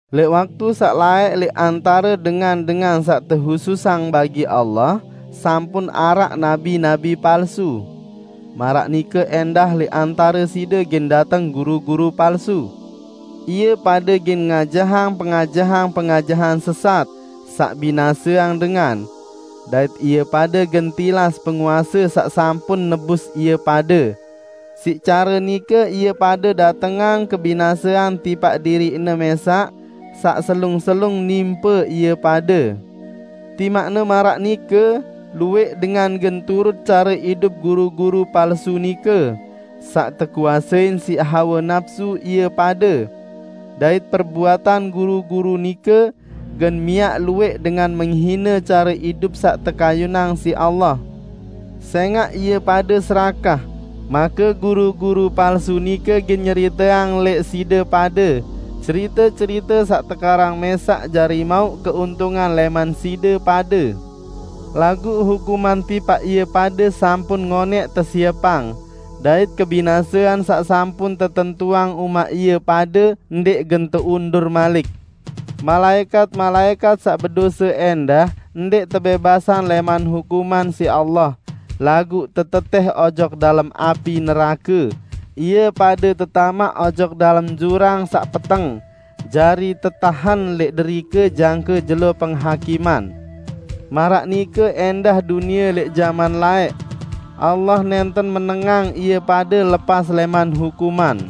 Lẽq waktu saq laẽq lẽq antare dengan-dengan saq tehususang bagi Allah sampun araq nabi-nabi palsu. Maraq nike ẽndah lẽq antare side gen dateng guru-guru palsu. Ie pade gen ngajahang pengajahan-pengajahan sesat, saq binaseang dengan. Dait ie pade gen tilas Penguase saq sampun nebus ie pade. Siq care nike ie pade datengang kebinasean tipaq diriqne mẽsaq, saq selung-selung nimpe ie pade. Timaqne maraq nike, luwẽq dengan gen turut care idup guru-guru palsu nike, saq tekuasein siq hawe napsu ie pade. Dait perbuatan guru-guru nike gen miaq luwẽq dengan menghine care idup saq tekayunang siq Allah. Sẽngaq ie pade serakah, make guru-guru palsu nike gen nyeriteang lẽq side pade cerite-cerite saq tekarang mẽsaq jari mauq keuntungan lẽman side pade. Laguq hukuman tipaq ie pade sampun ngonẽq tesiepang, dait kebinasean saq sampun tetentuang umaq ie pade ndẽq gen teundur malik. Malaẽkat-malaẽkat saq bedose ẽndah ndẽq tebẽbasang lẽman hukuman siq Allah, laguq tetetẽh ojok dalem api nerake, ie pade tetamaq ojok dalem jurang saq peteng, jari tetahen lẽq derike jangke jelo penghakiman. Maraq nike ẽndah dunie lẽq jaman laẽq, Allah nẽnten menengang ie pade lepas lẽman hukuman.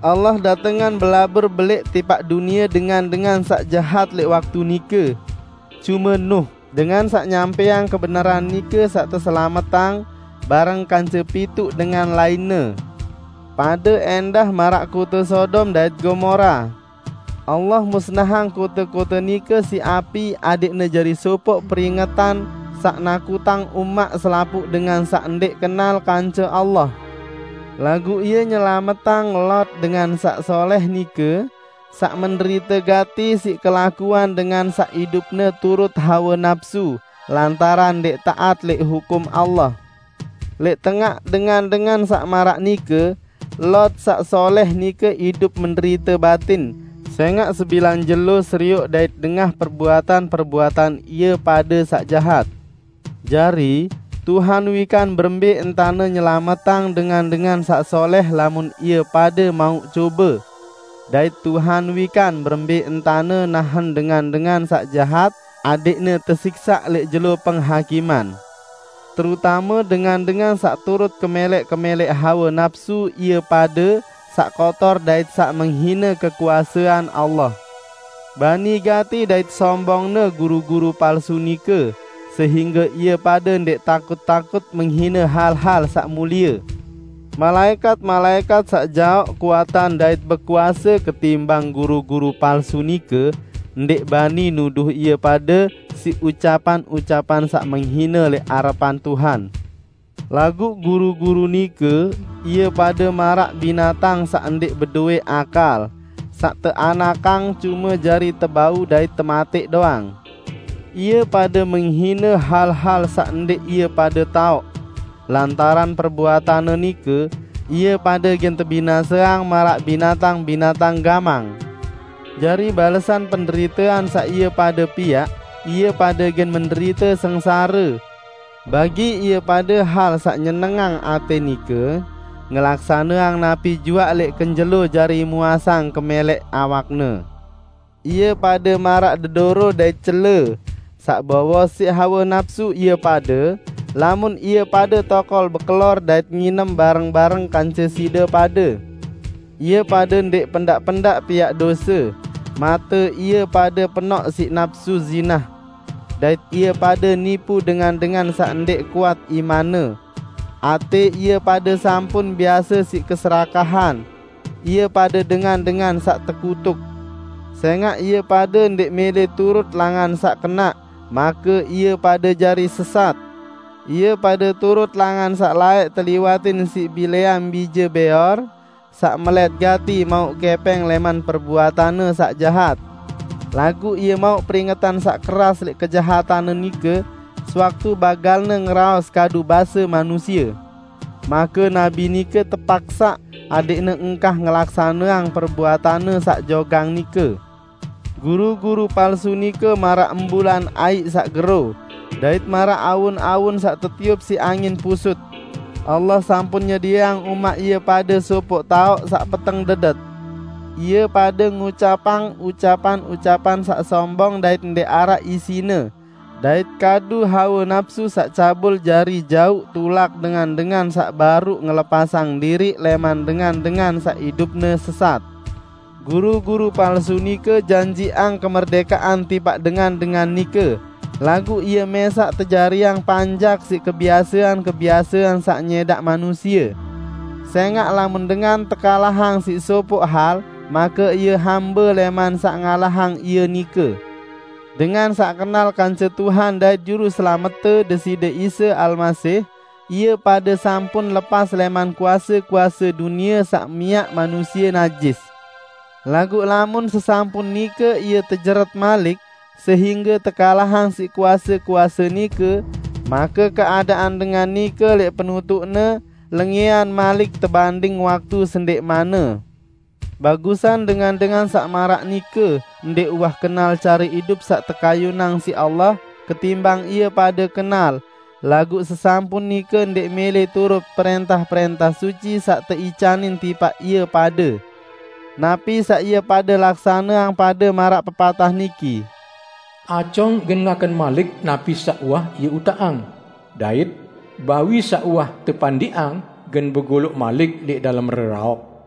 Allah datengang belabur belẽq tipaq dunie dengan-dengan saq jahat lẽq waktu nike. Cume Nuh, dengan saq nyampẽang kebenaran nike saq teselametang, bareng kance pituq dengan lainne. Pade ẽndah maraq kote Sodom dait Gomora: Allah musnahang kote-kote nike siq api adẽqne jari sopoq peringetan saq nakutang umaq selapuq dengan saq ndẽq kenal kance Allah. Laguq Ie nyelametang Lot, dengan saq solẽh nike, saq menderite gati siq kelakuan dengan saq idupne turut hawe napsu lantaran ndẽq taat lẽq hukum Allah. Lẽq tengaq dengan-dengan saq maraq nike, Lot saq solẽh nike idup menderite batin, sẽngaq sebilang jelo serioq dait dengah perbuatan-perbuatan ie pade saq jahat. Jari, Tuhan wikan berembẽ entane nyelametang dengan-dengan saq solẽh lamun ie pade mauq cobe. Dait Tuhan wikan berembẽ entane nahen dengan-dengan saq jahat adẽqne tesiksaq lẽq jelo penghakiman, terutame dengan-dengan saq turut kemẽlẽq-kemẽlẽq hawe napsu ie pade saq kotor dait saq menghine kekuasean Allah. Bani gati dait sombongne guru-guru palsu nike sehingge ie pade ndẽq takut-takut menghine hal-hal saq mulie. Malaẽkat-malaẽkat saq jaoq kuatan dait bekuase ketimbang guru-guru palsu nike, ndẽq bani nuduh ie pade siq ucapan-ucapan saq menghine lẽq arepan Tuhan. Laguq guru-guru nike, ie pade maraq binatang saq ndẽq bedowẽ akal, saq teanakang cume jari tebau dait tematẽq doang. Ie pade menghine hal-hal saq ndẽq ie pade taoq. Lantaran perbuatanne nike, ie pade gen tebinaseang maraq binatang-binatang gamang. Jari balesan penderitean saq ie pade piaq, ie pade gen menderite sengsare. Bagi ie pade hal saq nyenengang atẽ nike, ngelaksaneang napi juaq lẽq kenjelo jari muasang kemẽlẽq awakne. Ie pade maraq dedoro dait cele, saq bowos siq hawe napsu ie pade lamun ie pade tokol bekelor dait nginem bareng-bareng kance side pade. Ie pade ndẽq pendaq-pendaq piaq dose, mate ie pade penoq siq napsu zinah. Dait ie pade nipu dengan-dengan saq ndẽq kuat imanne. Atẽ ie pade sampun biase siq keserakahan. Ie pade dengan-dengan saq tekutuk. Sẽngaq ie pade ndẽq mẽlẽ turut langan saq kenaq, make ie pade jari sesat. Ie pade turut langan saq laẽq teliwatin siq Bileam, bije Beor, saq melẽt gati mauq kẽpẽng lẽman perbuatanne saq jahat. Laguq ie mauq peringetan saq keras lẽq kejahatanne nike, sewaktu bagalne ngeraos kadu base manusie. Make nabi nike tepaksaq adẽqne engkah ngelaksaneang perbuatanne saq jogang nike. Guru-guru palsu nike maraq embulan aiq saq gero dait maraq awun-awun saq tetiup siq angin pusut. Allah sampun nyedieang umaq ie pade sopoq taoq saq peteng dedet. Ie pade ngucapang ucapan-ucapan saq sombong dait ndẽq araq isine dait kadu hawe napsu saq cabul jari jauq tulak dengan-dengan saq baruq ngelepasang diriq lẽman dengan-dengan saq idupne sesat. Guru-guru palsu nike janjiqang kemerdẽkean tipaq dengan-dengan nike, laguq ie mẽsaq tejariang panjak siq kebiasean-kebiasean saq nyẽdaq manusie. Sẽngaq lamun dengan tekalahang siq sopoq hal, make ie hambe lẽman saq ngalahang ie nike. Dengan saq kenal kance Tuhan dait Juruselamette Deside Isa Almasih, ie pade sampun lepas lẽman kuase-kuase dunie saq miaq manusie najis. Laguq lamun sesampun nike ie tejeret malik sehingge tekalahang siq kuase-kuase nike, make keadaan dengan nike lẽq penutuqne lengẽan malik tebanding waktu sendẽqmanne. Bagusan dengan-dengan saq maraq nike ndẽq uwah kenal care idup saq tekayunang siq Allah, ketimbang ie pade kenal, laguq sesampun nike ndẽq mẽlẽ turut prẽntah-prẽntah suci saq teicanin tipaq ie pade. Napi saq ie pade laksaneang pade maraq pepatah niki, "Acong gen ngaken malik napi saq uwah ie utaqang", dait, "Bawi saq uwah tepandiqang, gen begoloq malik lẽq dalem reraok."